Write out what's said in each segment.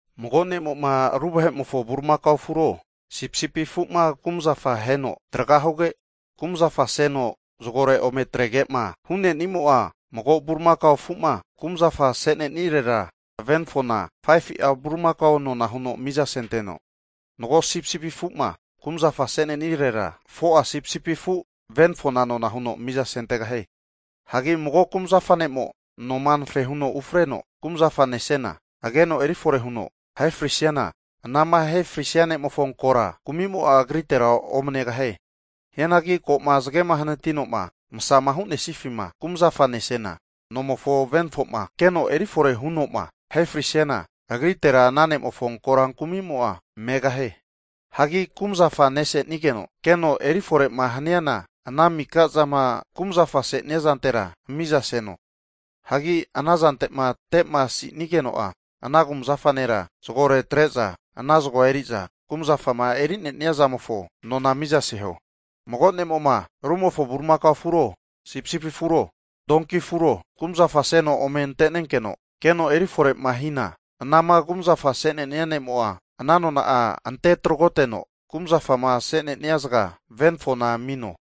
Mago ne'mo'ma ru vahe'mofo bulimakao afuro sipisipi afu'ma kumazafa aheno tragahuge, kumazafa seno zagore ome atrege'ma hu'nenimo'a, mago bulimakao afu'ma kumzafa asenenirera venafona 5fu'a bulimakao nona huno mizasenteno. Mago sipisipi afu'ma kumzafa asenesirera 4'a sipisipi afu venafona nona huno mizasentegahie. Hagi mago kumzafa ne'mo noma anafe huno ufreno kumzafa nesena, ageno erifore huno ahe frisiana, anama ahe frisia ne'mofo korankumimo'a agritera omanegahie. Hianagi ko'ma zagema hanati'noma masama hu'nesifima kumzafa nesena nomofo venafo'ma keno erifore huno'ma ahe frisiana, agritera ana ne'mofo korankumi'mo'a megahie. Hagi kumzafama nesenigeno keno eriforema haniana ana mika zama kumzafa se'nenia zantera mizaseno. Hagi ana zante'ma temaosinigeno'a, ana kumzafa nera zagore atre'za ana zagoa eri'za kumzafama eri'nea zamofo nona'a mizaseho. Mago ne'mo'ma rumofo bulimakao afuro, sipsipi afuro, donki afuro kumzafaseno ome ante'nenkeno keno erifore'ma hina, anama kumzafa se'nenia ne'mo'a ana nona'a ante tragoteno kumzafama ase'nenia zaga venafona amino.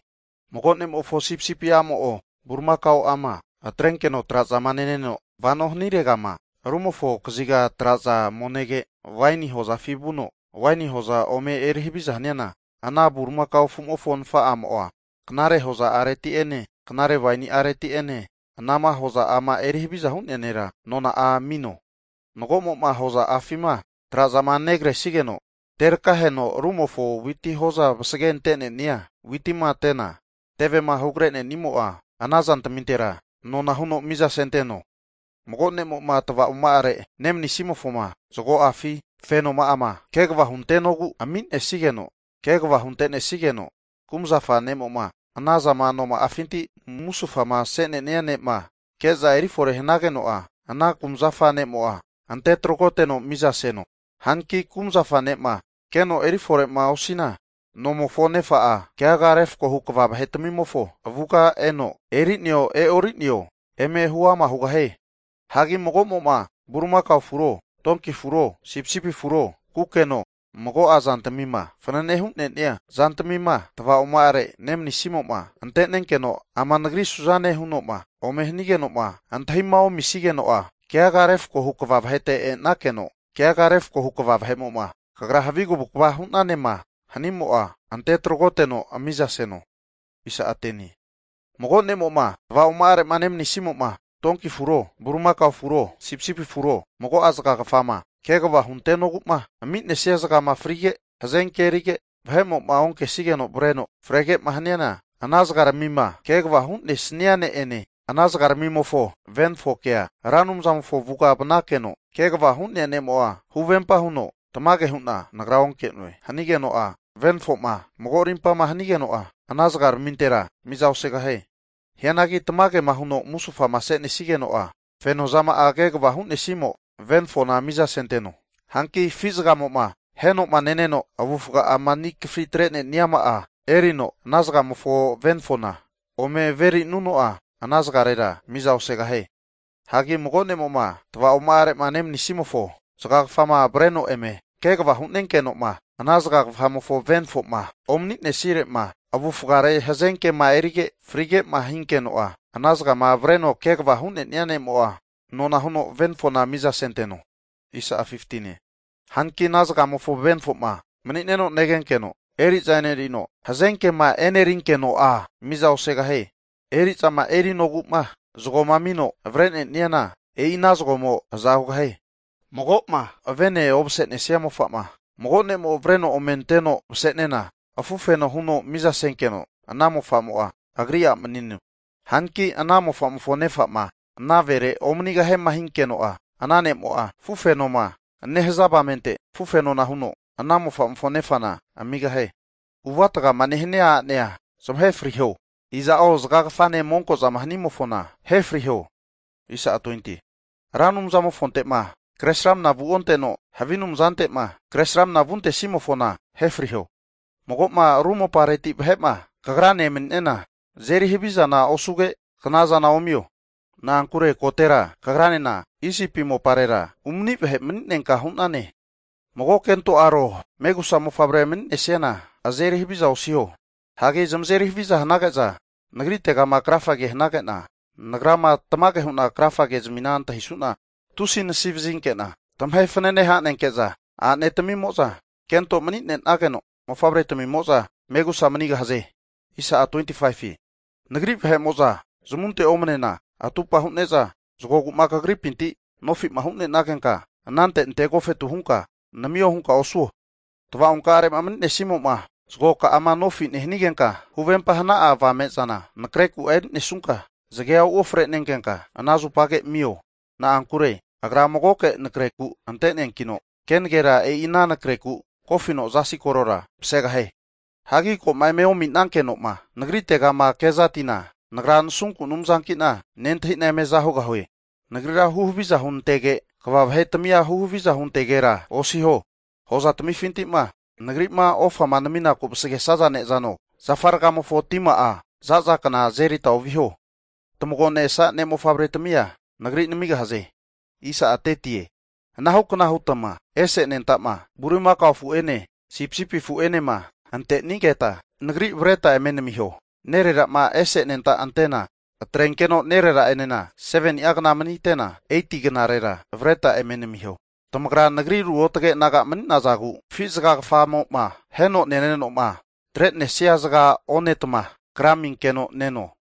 Mago ne'mofo sipsipi'amo'o bulimakao'ama atrenkeno trazama neno vano haniregama rumofo kaziga traza omenege, waini hozafi vuno waini hoza ome eri haviza haniana, ana bulimakao afu'mofo nafa'amo'a, knare hoza'areti'ene knare waini'areti'ene anama hoza'ama eri haviza hu'nea nera nona'a amino. Hagi mago'mo'ma hoza'afima trazama negresigeno tevemo'ma terakaheno rumofo witi hoza vasage ante'nenia witima tena, tevema hugre'nenimo'a ana zantmintera nona'a huno mizasenteno. Mago ne'mo'ma tavaoma'are nemanisimofoma zago'afi fenoma'ama, kegava huntenogu ami'nesigeno kegava hunte'nesigeno, kumzafa ne'mo'ma anazama noma'afinti musufama se'nenia ne'ma ke'za erifore hanageno'a ana kumazafa ne'mo'a ante tragoteno miza seno. Hanki kumzafa ne'ma keno erifore'ma osina, nomofo nefa'a keaga refkohu kva vahe'tmimofo avuga eno eri'neo e'o'rineo eme huama hugahie. Hagi mago'mo'ma bulimakao afuro, donki afuro, sipsipi afuro, kukeno, mago'a zantmima fanane hu'nenia zantmima tavaoma'are nemanisimo'ma ante'nenkeno, ama nagri suzane huno'ma ome hanige'noma antahima omisigeno'a keaga refkohu kva vahete e'nakeno keaga refkohu kva vahe'mo'ma, kagra havi kavukava hu'nanema hanimo'a ante tragoteno mizaseno. Mago ne'mo'ma tava'oma'are'ma nemanisimo'ma donki afuro, bulimaka afuro, sipsipi afuro, mago'a zagagafama kegava huntenogu'ma ami'nesia zagamo'ma frige, hazenke erige, vahe'mo'ma onkesigeno avreno frege'ma haniana, ana zagarmima kegava hu'nesnia ne'ene ana zagaramimofo venafokea Ra Anumzamofo avuga vanakeno kegavama hu'nemo'a huvempa huno, tamage hu'na nagra onke'noe hanigeno'a, venafo'ma mago rimpama hanigeno'a ana zagaramintera miza osegahie. Hianagi tamagema huno musufama se'nesageno'a, fenozama'ama kegava hu'nesimo venafona mizasenteno. Hanki afi zagamo'ma aheno'ma neneno, avufga'ama ani kafritre'neniama'a erino, ana zagamofo venafoma ome averi'nuno'a ana zagarera miza osegahie. Hanki mago ne'mo'ma, tava'oma'are'ma nemanisimofo zagagafama avreno eme kegava hu'nenkeno'ma, ana zagagafamofo venafo'ma omani'nensire'ma avufgare hazenkema erige frige'ma hinkeno'a, ana zagama avreno kegava hu'ne'nia ne'mo'a nona huno venafona mizasenteno. Hanki ana zagamofo venafo'ma mani'neno negenkeno, eri'za e'nerino hazenkema erinkeno'a, miza osegahie. Eri'zama erinogu'ma zagoma amino avre'neniana, e'i ana zagomo aza hugahie. Mago'ma vene ovase'nesia mofa'ma mago ne'mo'ma avreno ome anteno vase'nena afufeno huno mizasenkeno ana mofamo'a agri a' manino. Hanki ana mofa'mofo nefa'ma, ana vere omanigahiema hinkeno'a, ana ne'mo'a afufenoma nehaza avamente afufenona huno ana mofa'mofo nefana amigahie. Avuatgama nehania a'nea zamahe friho. Iza'o zagagafanema monko'zama hanimofona ahe friho. Ra Anumzamofonte'ma kresramna vuonteno, havi anumazante'ma kresramnama vuntesimofona ahe friho. Mago'ma ru mopareti vahe'ma kagrane emani'nena, azeri havi zana osuge knazana omio. Na'ankure kotera kagranena Isipi moparera umani vahe mani'nenka hu'nane. Mago'ma kento aro, megusa mofavrema mani'nesiana azeri haviza osiho. Hagi zamazeri haviza hanage'za, Nagritegama krafa hanage'na, Nagrama tamage hu'na krafagezmi antahisu'na, tusi nasivazinke'na tamahe fanane hanenke'za a'netamimo'za kento mani'nageno, mofavre tamimo'za megusa manigahaze. Nagri vahe'mo'za zamunte omanena atupa hu'ne'za zagoma kagripinti nofi'ma hu'nenagenka, anante ante agofetu hunka namio hunka osuo. Tava'onkare'ma nemanisimo'ma zagoka'ama nofi nehanigenka huvempa hana'a avame'zana anakre ku'a eri'nesunka, zagea uofre'nenkenka ana zupage amio. Na'ankure agra magoke nakreku ante'neankino, kenagera e'i ana anakre ku kofino zasi korora vasegahie. Hagi ko'ma eme ominankeno'ma Nagritegama kezatina, Nagra nasunku Anumzanki'na nentahi'na eme aza hugahue. Nagrira huhaviza hunantege, kva vahetamia huhaviza huntegera osiho. Hozatamifinti'ma Nagri'ma ofama naminaku'ma vasagesaza ne'zano, zafa rgamofo tima'a za'za kna azerita oviho. Tamagonesa ne'mofavre'tamia Nagri namigahaze. Anahukna hutma ese anenta'ma bulimakao afu'mo'ene sipisipi afu'mo'enema antenigeta Nagri avretma eme namiho. Nerera'ma ese anentama antena atrenkeno nerera'enena 7ni'a kna manite'na, 8ti knarera avreta eme namiho. Tamagra Nagri ruotge naga mani'nazagu, afi zagagafamo'ma aheno neneno'ma atre'nesia zaga onetma kra aminkeno neno.